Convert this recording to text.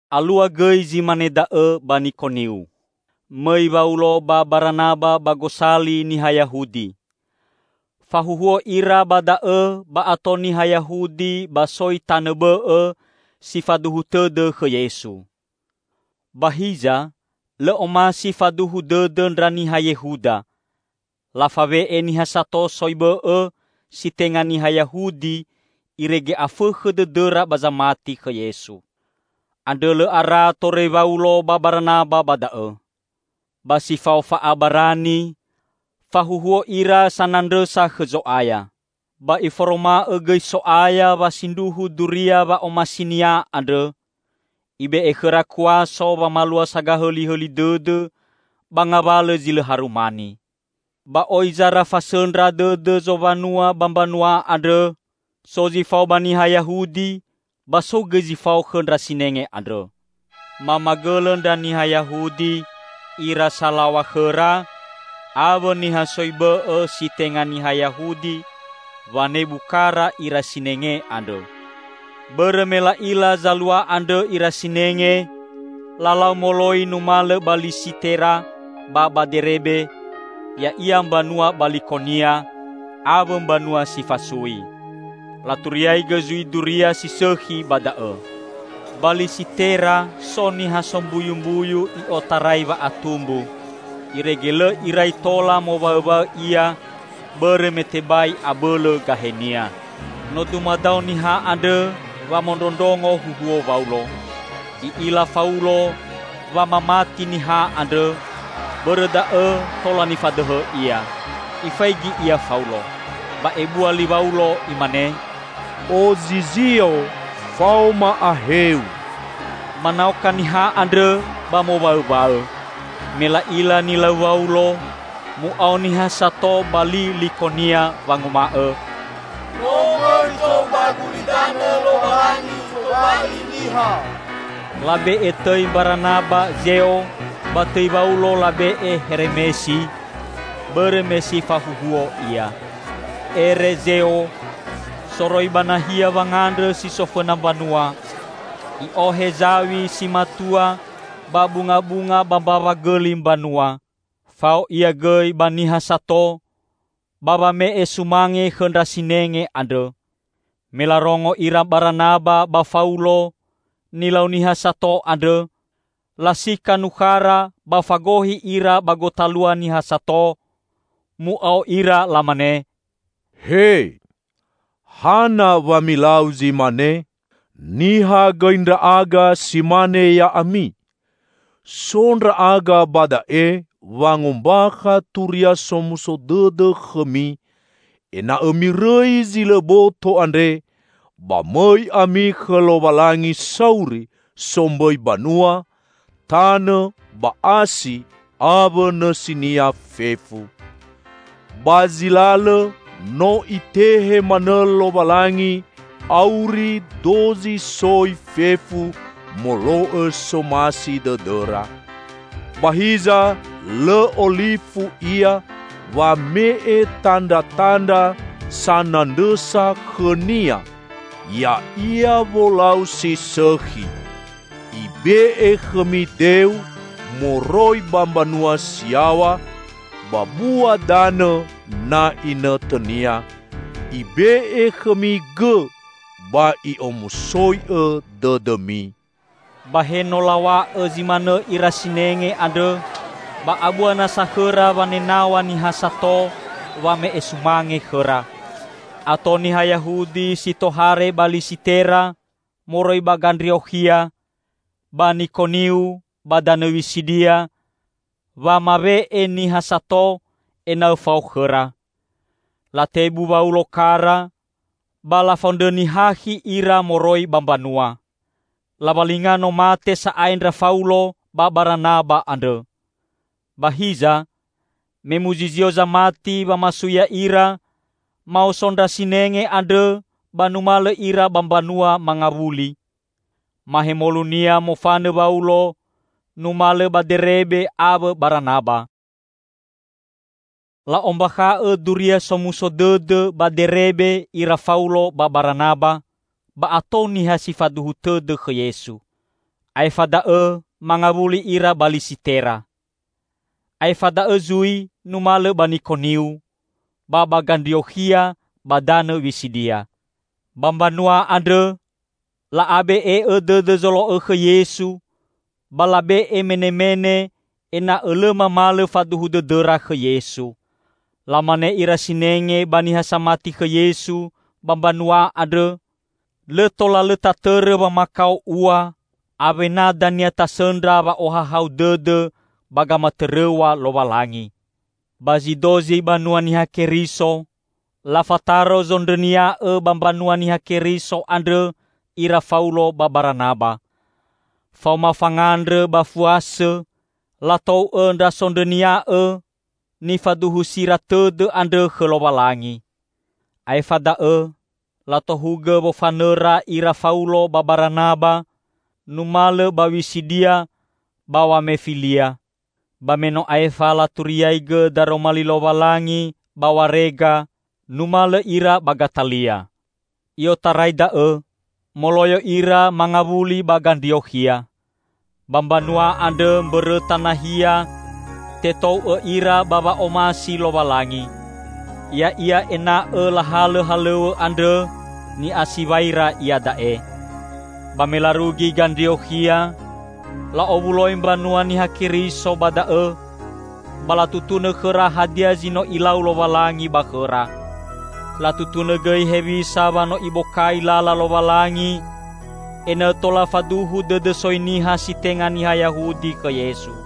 Alua gõi zi mane da'õ ba Nikoniu. Mõi Waulo ba Baranaba ba gosali niha Yahudi. Fahuhuo ira ba da'õ ba ato niha Yahudi ba soi tanõ bõ'õ si faduhu tõdõ khõ Yesu. Ba hiza lõ omasi faduhu dõdõ ndra niha Yehuda, lafawe'e niha sato soi bõ'õ si tenga niha Yahudi irege afõkhõ dõdõra ba zamati khõ Yesu. Andrõ lõ ara torõi Waulo ba Baranaba ba da'õ. Ba si fao fa'abarani fahuhuo ira sanandrõsa khõ Zo'aya. Ba Iforoma'õ gõi So'aya wa sindruhu duria wa'omasi-Nia andrõ; Ibe'e khõra kuaso wamalua sagahõlihõli dõdõ ba ngawalõ zi lõ harumani. Ba oi zara fasõndra dõdõ zowanua ba mbanua andrõ; so zi fao ba niha Yahudi ba so gõi zi fao khõ ndra sinenge andrõ. Mamagõlõ ndra niha Yahudi, ira salaw̃a khõra, awõ niha soi bõ'õ si tenga niha Yahudi, wanebu kara ira sinenge andrõ. Bõrõ me la'ila zalua andrõ ira sinenge, lalau moloi numalõ ba Lisitera ba ba Derebe, ya'ia mbanua ba Likonia, awõ mbanua si fasui. Laturiaigõ zui duria si sõkhi ba da'õ. Ba Lisitera so niha sombuyumbuyu i'otarai wa'atumbu, irege lõ irai tola mowaõwaõ ia bõrõ me tebai abõlõ gahenia. No dumadao niha andrõ wamondrondrongo huhuo Waulo. I'ila Faulo wa mamati niha andrõ, bõrõ da'õ tola nifadõhõ ia. Ifaigi ia Faulo. Ba ebua li Waulo imane, "Ozizio, faoma aheu!" Manaoka niha andrõ ba mowaõwaõ. Me la'ila nilau Waulo, mu'ao niha sato ba li Likonia wanguma'õ, "No mõi tou ba gulidanõ Lowalangi tobali niha." Labe'e tõi Mbaranaba Zeo, ba tõi Waulo labe'e Heremesi, bõrõ me si fahuhuo ia. Ere Zeo, soroi ba nahia wangandrõ si so fõna mbanua, i'ohe zaw̃i si matua ba bungabunga ba mbawa gõli mbanua. Fao ia gõi ba niha sato ba wame'e sumange khõ ndra sinenge andrõ. Melarongo ira Baranaba ba Faulo nilau niha sato andrõ, lasika nukhara ba fagohi ira ba gotalua niha sato, mu'ao ira lamane, "He, hana wa milau zi mane? Niha gõi ndra'aga si mane ya'ami! So ndra'aga ba da'e wangombakha Turia Somuso Dõdõ khõmi ena'õ mirõi zi lõ boto andre ba mõi ami khõ Lowalangi sauri, sombõi banua, tanõ ba asi awõ nõsinia fefu. Ba zi lalõ no Itehe manõ Lowalangi auri dozi soi fefu molo'õ somasi dõdõra. Ba hiza lõ olifu Ia wame'e tandratandra sanandrõsa khõ-Nia, ya'ia wolau si sõkhi. Ibe'e khõmi deu moroi ba mbanua si yaw̃a ba bua danõ na inõtõnia. Ibe'e khõmi gõ ba I'omusoi'õ dõdõmi." Ba he no law̃a'õ zi manõ ira sinenge andrõ, ba abua nasa khõra wanenaw̃a niha sato wame'e sumange khõra. Ato niha Yahudi si tohare ba Lisitera moroi ba Gandriokhia, ba Nikoniu ba danõ Wisidia wamawe'e niha sato ena'õ fao khõra. Latebu Waulo kara, ba lafondrõni hakhi ira moroi ba mbanua. Lawalinga no mate sa'ae ndra Faulo ba Baranaba andrõ. Ba hiza, me muzizio zamati wamasui ya'ira, maoso ndra sinenge andrõ ba numalõ ira ba mbanua mangawuli. Mahemolunia mofanõ Waulo numalõ ba Derebe awõ Baranaba. La'ombakha'õ Duria Somuso Dõdõ ba Derebe ira Faulo ba Baranaba ba ato niha si faduhu tõdõ khõ Yesu. Aefa da'õ mangawuli ira ba Lisitera. Aefa da'õ zui numalõ ba Nikoniu, ba ba Gandriokhia ba danõ Wisidia. Ba mbanua andrõ la'abe'e'õ dõdõ zolo'õ khõ Yesu ba labe'e menemene ena'õ lõ mamalõ faduhu dõdõra khõ Yesu. Lamane ira sinenge ba niha samati khõ Yesu ba mbanua andrõ, "Lõ tola lõ tatõrõ wamakao ua, awena dania tasõndra wa'ohahau dõdõ ba gamatõrõw̃a Lowalangi." Ba zi dozi banua Niha Keriso, lafataro zondrõnia'õ ba mbanua Niha Keriso andrõ ira Faulo ba Baranaba. Faoma fangandrõ ba fuasõ latou'õ ndra sondrõnia'õ nifaduhusira tõdõ andrõ khõ Lowalangi. Aefa da'õ latohugõ wofanõra ira Faulo ba Baranaba numalõ ba Wisidia ba Wamefilia. Ba me no aefa laturiaigõ daroma li Lowalangi ba Warega, numalõ ira ba Gatalia. I'otarai da'õ moloyo ira mangawuli ba Gandriokhia. Ba mbanua andrõ mbõrõta nahia tetou'õ ira ba wa'omasi Lowalangi, ya'ia ena'õ lahalõ halõw̃õ andrõ ni'asiwaira iada'e. Ba me larugi Gandriokhia, la'owuloi mbanua Niha Keriso ba da'õ, ba latutunõ khõra hadia zi no Ilau Lowalangi ba khõra. Latutunõ gõi hewisa wa no Ibokai lala Lowalangi ena'õ tola faduhu dõdõ soi niha si tenga niha Yahudi khõ Yesu.